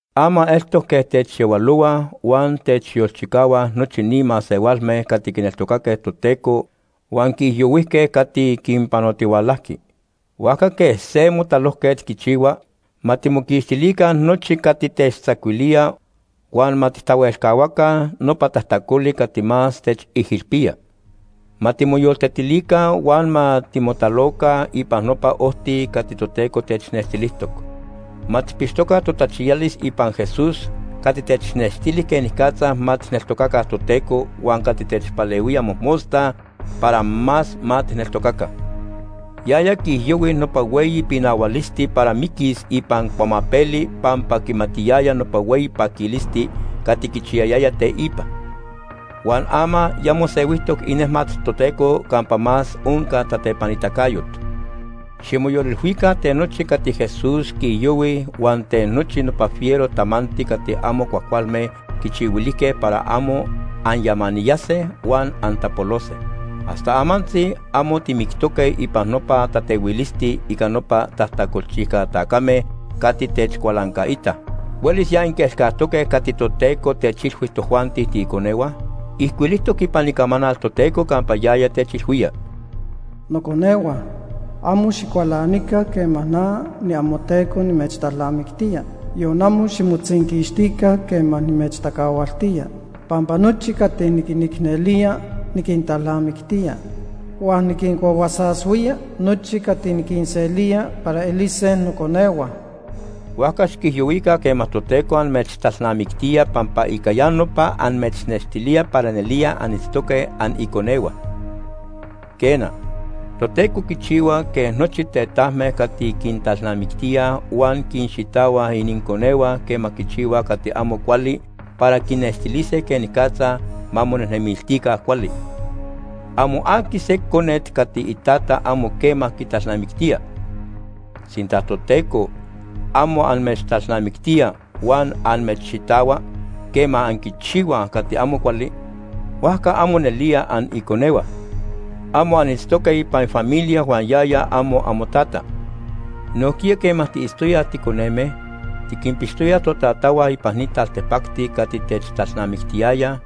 Ama eltoc quej techyahualohuaj huan techyolchicahuaj nochi ni masehualme cati quineltocaque Toteco huan quiijyohuijque cati quinpanotihualajqui. Huajca quej se motalojquet quichihua, ma timoquixtilica nochi cati techtzacuilía huan ma tijtahuelcahuaca nopa tajtacoli cati más techijilpía. Ma timoyoltetilica huan ma timotaloca ipan nopa ojti cati Toteco technextilijtoc. Ma tijpixtoca totachiyalis ipan Jesús cati technextili quenicatza ma tijneltocaca Toteco huan cati techpalehuía mojmosta para más ma tijneltocaca. Yaya quiijyohui nopa hueyi pinahualisti para miquis ipan cuamapeli pampa quimatiyaya nopa hueyi paquilisti cati quichiyayaya teipa. Huan ama ya mosehuijtoc inejmat Toteco campa más onca tatepanitacayot. Ximoyolilhuica ten nochi cati Jesús quiijyohui huan ten nochi nopa fiero tamanti cati amo cuajcualme quichihuilijque para amo anyamaniyase huan antapolose. Hasta amantzi amo timictoque ipan nopa tatehuilisti ica nopa tajtacolchijca tacame cati techcualancaitaj. ¿Huelis ya anquielcajtoque cati Toteco techilhui tojuanti tiiconehua? Ijcuilijtoc ipan Icamanal Toteco campa yaya techilhuía: “Noconehua, amo xicualanica quema na niamoTeco nimechtalnamictía, yon amo ximotzinquixtica quema nimechtacahualtía. Pampa nochi cati niquinicnelía, niquintalnamictía, huan niquincuahuasashuía nochi cati niquinselía para elise noconehua.” Huajca xiquijyohuica quema Toteco amechtalnamictía pampa ica ya nopa amechnextilía para nelía anitztoque aniconehua. Quena, Toteco quichihua quej nochi tetajme cati quintalnamictíaj huan quinxitahuaj ininconehua quema quichihuaj cati amo cuali para quinnextilise quenicatza ma monejnemiltica cuali. Amo aqui se conet cati itata amo quema quitalnamictía. Sinta Toteco amo amechtalnamictía huan amechxitahua quema anquichihuaj cati amo cuali, huajca amo nelía aniconehua. Amo anitztoque ipan ifamilia huan yaya amo amoTata. Nojquiya quema tiitztoyaj ticoneme, tiquinpixtoyaj totatahua ipan ni taltipacti cati techtalnamictiyayaj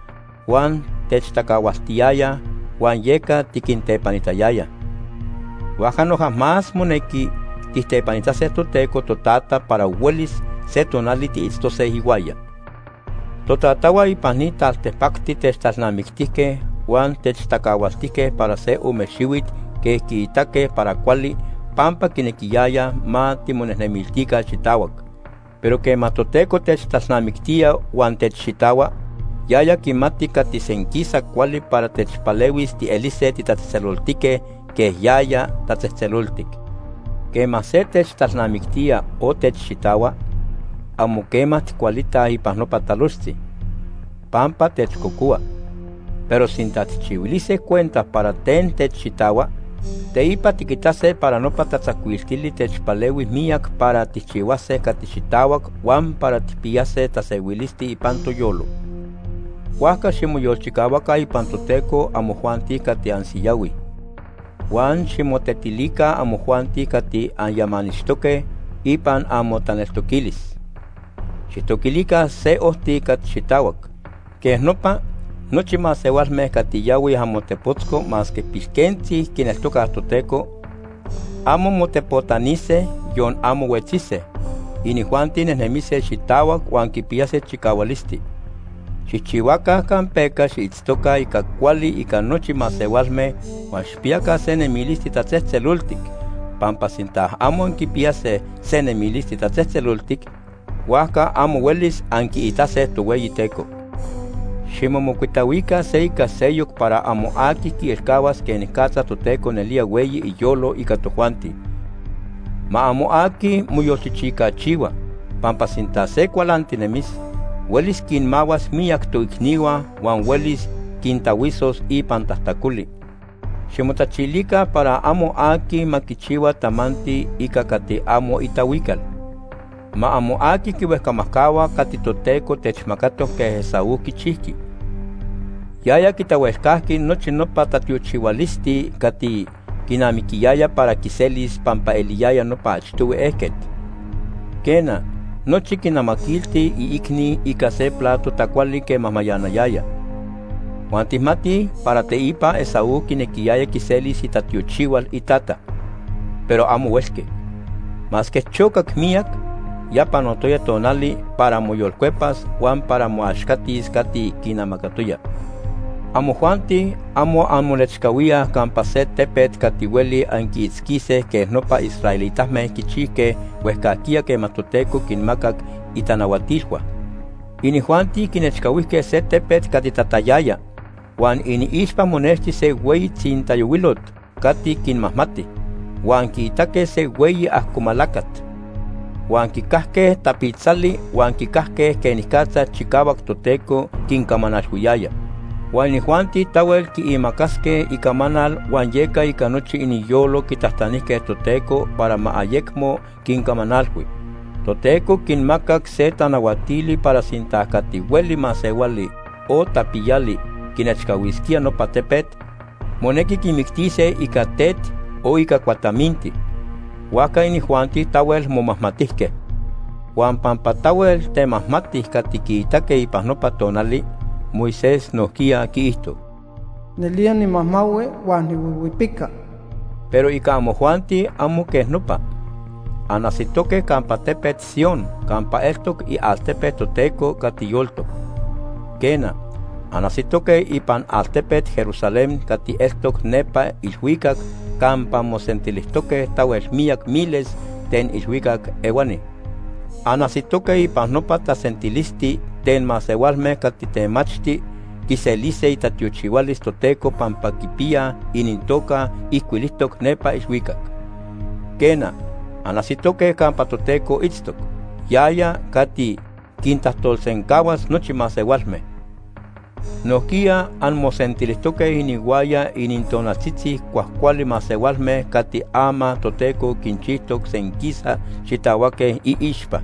huan techtacahualtiyayaj huan yeca tiquintepanitayayaj. Huajca noja más monequi tijtepanitase Toteco Totata para huelis se tonali tiitztose ihuaya. Totatahua ipan ni taltipacti techtalnamictijque huan techtacahualtijque para se ome xihuit quej quiitaque para cuali pampa quinequiyayaj ma timonejnemiltica xitahuac. Pero quema Toteco techtalnamictía huan techxitahua, yaya quimati cati senquisa cuali para techpalehuis tielise titatzejtzeloltique quej yaya tatzejtzeloltic. Quema se techtalnamictía o techxitahua, amo quema tijcualitaj ipan nopa talojtzi, pampa techcocohua. Pero sinta tijchihuilise cuenta para ten techxitahua, teipa tiquitase para nopa tatzacuiltili techpalehui miyac para tijchihuase cati xitahuac huan para ma tijpiyaca tasehuilisti ipan toyolo. Huajca ximoyolchicahuaca ipan Toteco amojuanti cati ansiyahuij. Huan ximotetilica amojuanti cati anyamanixtoque ipan amotaneltoquilis. Xijtoquilica se ojti cati xitahuac. Quej nopa, nochi masehualme cati yahuij amotepotzco masque pilquentzi quineltocaj Toteco, amo motepotanise, yon amo huetzise. Inijuanti nejnemise xitahuac huan quipiyase chicahualisti. Xijchihuaca campeca xiitztoca ica cuali ica nochi masehualme huan xijpiyaca se nemilisti tatzejtzeloltic, pampa sinta amo anquipiyase se nemilisti tatzejtzeloltic, huajca amo huelis anquiitase Tohueyiteco. Ximomocuitahuica se ica seyoc para amo aqui quielcahuas quenicatza Toteco nelía hueyi iyolo ica tojuanti. Ma amo aqui moyolchichicachihua, pampa sinta se cualantinemis, huelis quinmahuas miyac toicnihua huan huelis quintahuisos ipan tajtacoli. Ximotachilica para amo aqui ma quichihua tamanti ica cati amo itahuical. Ma amo aqui quihuejcamajcahua cati Toteco techmacatoc quej Esaú quichijqui. Yaya quitahuelcajqui nochi nopa tatiochihualisti cati quinamiquiyaya para quiselis pampa eliyaya nopa achtohui ejquet. Quena, nochi quinamaquilti iicni ica se plato tacuali quema mayanayaya. Huan tijmatij para teipa Esaú quinequiyaya quiselis itatiochihual itata, pero amo huelqui. Masque chocac miyac, ya panotoya tonali para moyolcuepas huan para moaxcatis cati quinamacatoya. Amojuanti amo anmonechcahuíaj campa se tepet cati hueli anquiitzquise quej nopa israelitame quichijque huejcajquiya quema Toteco quinmacac itanahuatilhua. Inijuanti quinechcahuijque se tepet cati tatayaya, huan iniixpa monexti se hueyi tzintayohuilot cati quinmajmati, huan quiitaque se hueyi ajcomalacat. Huan quicajque tapitzali huan quicajque quenicatza chicahuac Toteco quincamanalhuiyaya. Huan inijuanti tahuel quiimacasque icamanal huan yeca ica nochi iniyolo quitajtanijque Toteco para ma ayecmo quincamanalhui. Toteco quinmacac se tanahuatili para sinta cati hueli masehuali o tapiyali quinechcahuisquía nopa tepet, monequi quimictise ica tet o ica cuataminti. Huajca inijuanti tahuel momajmatijque. Huan pampa tahuel temajmati cati quiitaque ipan nopa tonali, Moisés nojquiya quiijto: “Nelía nimajmahui huan nihuihuipica.” Pero ica amojuanti amo quej nopa. Anajsitoque campa tepet Sion campa eltoc ialtepe Toteco cati yoltoc. Quena, anajsitoque ipan altepet Jerusalén cati eltoc nepa ilhuicac campa mosentilijtoque tahuel miyac miles ten ilhuicac ehuani. Anajsitoque ipan nopa tasentilisti ten masehualme cati temachti quiselise itatiochihualis Toteco pampa quipiyaj inintoca ijcuilijtoc nepa ilhuicac. Quena, anajsitoque campa Toteco itztoc, yaya cati quintajtolsencahuas nochi masehualme. Nojquiya anmosentilijtoque inihuaya inintonaltzitzi cuajcuali masehualme cati ama Toteco quinchijtoc senquisa xitahuaque iixpa.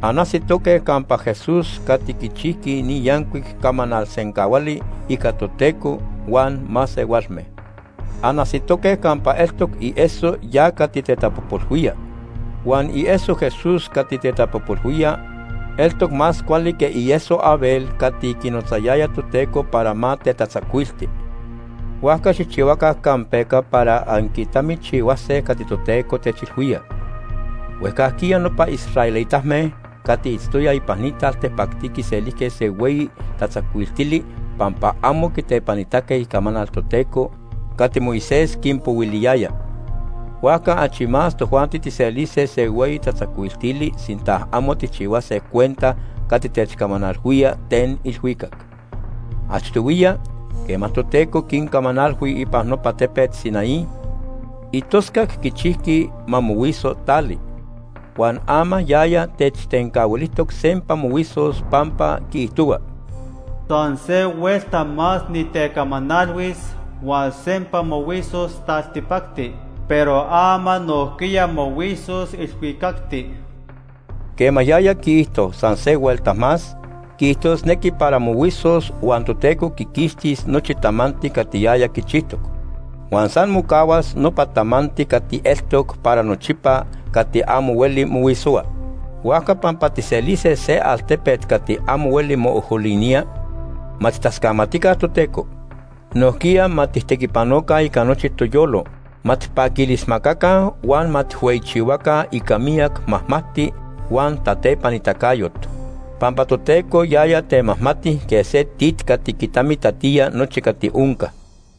Anajsitoque campa Jesús cati quichijqui ni yancuic camanal sencahuali ica Toteco huan masehualme. Anajsitoque campa eltoc ieso ya cati tetapojpolhuía. Huan ieso Jesús cati tetapojpolhuía eltoc más cuali que ieso Abel cati quinotzayaya Toteco para ma tetatzacuilti. Huajca xijchihuaca campeca para anquitamichihuase cati Toteco techilhuía. Huejcajquiya nopa israelitame cati itztoyaj ipan ni taltipacti quiselijque se hueyi tatzacuiltili pampa amo quitepanitaque icamanal Toteco cati Moisés quinpohuiliyaya. Huajca achi más tojuanti tijselise se hueyi tatzacuiltili sinta amo tijchihuase cuenta cati techcamanalhuía ten ilhuicac. Achtohuiya, quema Toteco quincamanalhui ipan nopa tepet Sinaí, itoscac quichijqui ma mohuiso tali. Huan ama yaya techtencahuilijtoc sempa mohuisos pampa quiijtohua: “San se huelta más nitecamanalhuis, huan sempa mohuisos taltipacti. Pero ama nojquiya mohuisos ilhuicacti.” Quema yaya quiijto: “San se huelta más”, quiijtosnequi para mohuisos huan Toteco quiquixtis nochi tamanti cati yaya quichijtoc. Huan san mocahuas nopa tamanti cati eltoc para nochipa cati amo hueli mohuisohua. Huajca pampa tijselise se altepet cati amo hueli moojolinía, ma tijtascamatica Toteco. Nojquiya ma tijtequipanoca ica nochi toyolo, ma tijpaquilismacaca huan ma tijhueyichihuaca ica miyac majmajti huan tatepanitacayot, pampa Toteco yaya temajmati quej se tit cati quitamitatía nochi cati onca.